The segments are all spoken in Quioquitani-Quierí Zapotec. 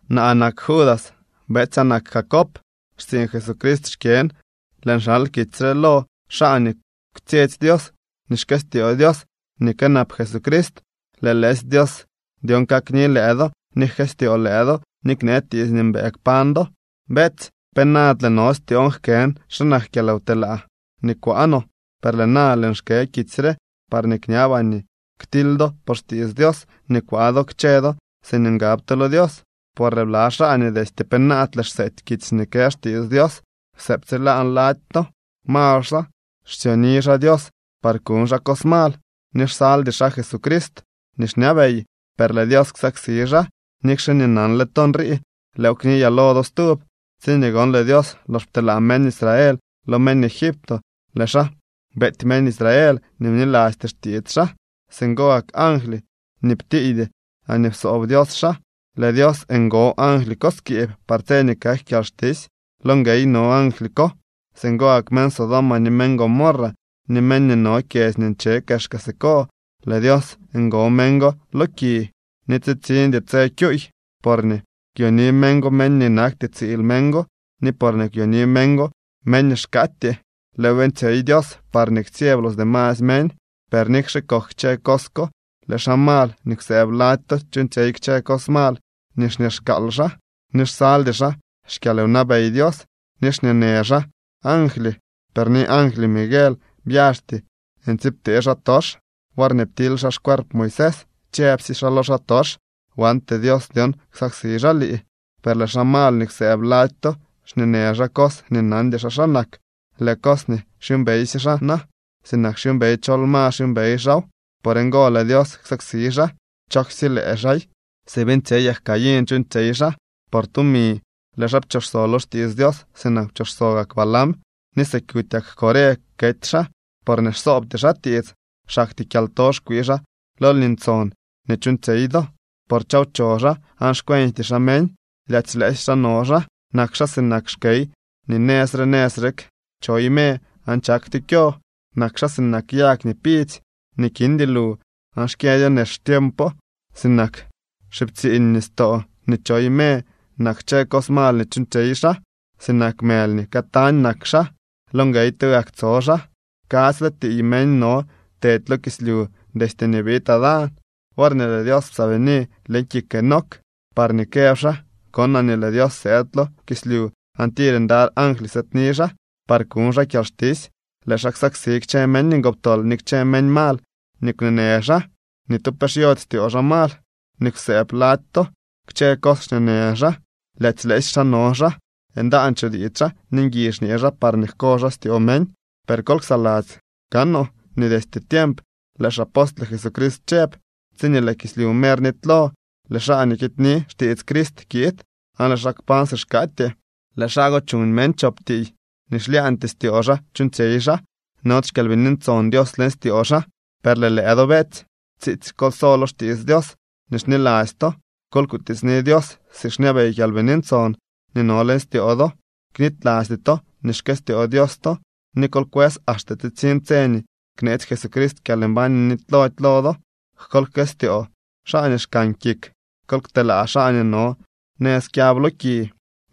Naa nak Judas, betsyaa nak Jacob, xtsiiñ Jesucrist xkyën. Lëën xal kitsy re lo xaa nii kwtsyetsy Dios ni xkëstyoo Dios ni kënap Jesucrist. Lëë lëësy Dios dyon kakni lëë do ni jkëstyoo lëë do ni knee tiits nii mbëë kpañ do. Beetsy, penaadle no styoon jkën xa nak kyalwtelaa nii kwaa no, per lëë na lëën xkë kitsy re parñee kñabaa nii ktily do por xtiits Dios nii kwaa do kchë do siñee ngab to lo Dios. Por lëë bla xaa nii destye penaadle xseety kitsy nii kë xtiits Dios kwsëëbtsilaan lady to. Mal xaa, xsyoni xaa Dios par kuñ xaa cos mal ni xsaldy xaa Jesucrist nii xñabey, per lëë Dios ksaksi xaa. Nikxe nii nanle to nrii lëëw kniyaa lo do stub. Tsiñee gon lëë Dios lox pteelaa meñ Israel lo meñ Egipto, lëë xaa beety meñ Israel nii bnilasty xtiits xaa. Singo gak angly nii ptiiydy laañee psoob Dios xaa, lëë Dios ngo angly ko skiib par tse nii kak kyalxtisy. Lo nguey no angly ko. Singo gak meñ Sodoma, ni meñ Gomorra, ni meñ nii no kyedzy nii nche kexka siko, lëë Dios ngo meñ go lo ki nii tsitsiñdy tse kyuuy, porñee kwyoni meñ go meñ nii nakty tsiil meñ go ni porñee kwyoni meñ go meñ nii xkaatyee. Lëëw beeñtsyey Dios parñee ktsyeb los demasy meñ. Per nikxe kok kchë cos ko, lëë xaa mal nii kwsëëb lady to chuuñtsyey kchë cos mal nii xñeexkaal xaa, ni xsaldy xaa xkyalwnabey Dios, ni xñeenë xaa angly. Per ni angly Miguel byaxty ntsiibtee xaatox worñee ptily xaa xcuerp Moisés. Chëbsye xaa lo xaatox: “Wante Dios dyon ksaksi xaa lii.” Per lëë xaa mal nii kwsëëb lady to xñeenë xaa cos nii nandy xaa xa nak. Lëë cos nii xyuumbeysye xaa na, sinak xyuumbey chol ma xyuumbey xaaw. Por ngo lëë Dios ksaksi xaa. ¡Chooksye lëë xaay! Si beeñtsyeyak Caín chuuñtsyey xaa. Por tumi lëë xaa pchooxso lo xtiits Dios sinak pchooxso gak Balaam, ni si kutyak Coré kety xaa porñee xsoobty xaa tiits. Xaktyee kyalto xkwii xaa lo lni ntson nii chuuñtsyey do, por chawcho xaa aan xcuenjty xaa meñ. Lyaadzy lëësy xaa no xaa. Nak xaa sinak xkey nii nëz re nëz rek choy me aan chaktyo kyo. Nak xaa sinak yag nii pidzy nii kindy lu aan xkyëdyo nex xtiempo. Sinak xiptsiiñ nistoo nii choy me nak kchë cos mal nii chuuñtsyey xaa. Sinak mëly nii këtañ nak xaa, lo nguey tugak tso xaa. Kadzyle tiiy meñ no tedy lo kislyu destye nii biid Adán, worñee lëë Dios psaabini leñ kik Enoc parñee këb xaa: “Konaa nii lëë Dios sëëd lo kislyu aan tir ndaly angly sëëdni xaa par kuñ xaa kyalxtisy. Lëë xaa ksaksi kchë meñ ngoptol ni kchë meñ mal nii kwneenë xaa.” Ni tu pe xyody styoo xaa mal nii kwsëëb lady to. Kchë cos xñeenë xaa, lyaadzy lëësy xaa no xaa, ndaan chutiits xaa, ni ngui xñee xaa parñee jko xaa styoo meñ. Per kol ksaladzy kaanoo nii destye tiemp lëë xapostle Jesucrist chëb: “Tsiñee lëë kislyu mer nitylo lëë xaa nii kidyni xtiits Crist kiid aan lëë xaa kpañ si xkaatyee.” Lëë xaa go chuñ meñ chop tiiy, nii xlyaañtyee styoo xaa chuuñtsyey xaa, nody xKyalbini Ntson Dios leñ styoo xaa. Per lëë lëë do, beetsy, tsiitsy kol so lo xtiits Dios nii xniladzy to. Kol kutiitsni Dios si xñabey Kyalbini Ntson nii no leñ styoo do. Knitylasty to nii xkëstyoo Dios to ni kol kwës axte tsitsiñ tse nii kneetsy Jesucrist kyalmbañ nii nitylody lo do. Kol jkëstyoo xaa nii xkan kik. Kol kteelaa xaa nii no nëz kyab lo ki,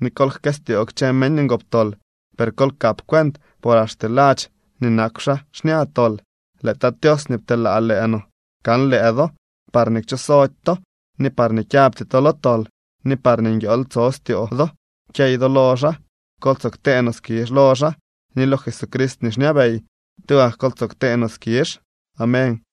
ni kol jkëstyoo kchë meñ ngoptol, per kol kap cuent por axte ladx nii nakw xaa xña tol. Lëë Tat Tios nii pteelaa lëë no kan lëë do parñee kchooxsody to, ni parñee kyabty to lo tol, ni parñee nguiool tso styoo do kyey do lo xaa. Kol tsoo ktee no skizh lo xaa ni lo Jesucrist nii xñabey. Tugak kol tsoo ktee no skizh. Amén.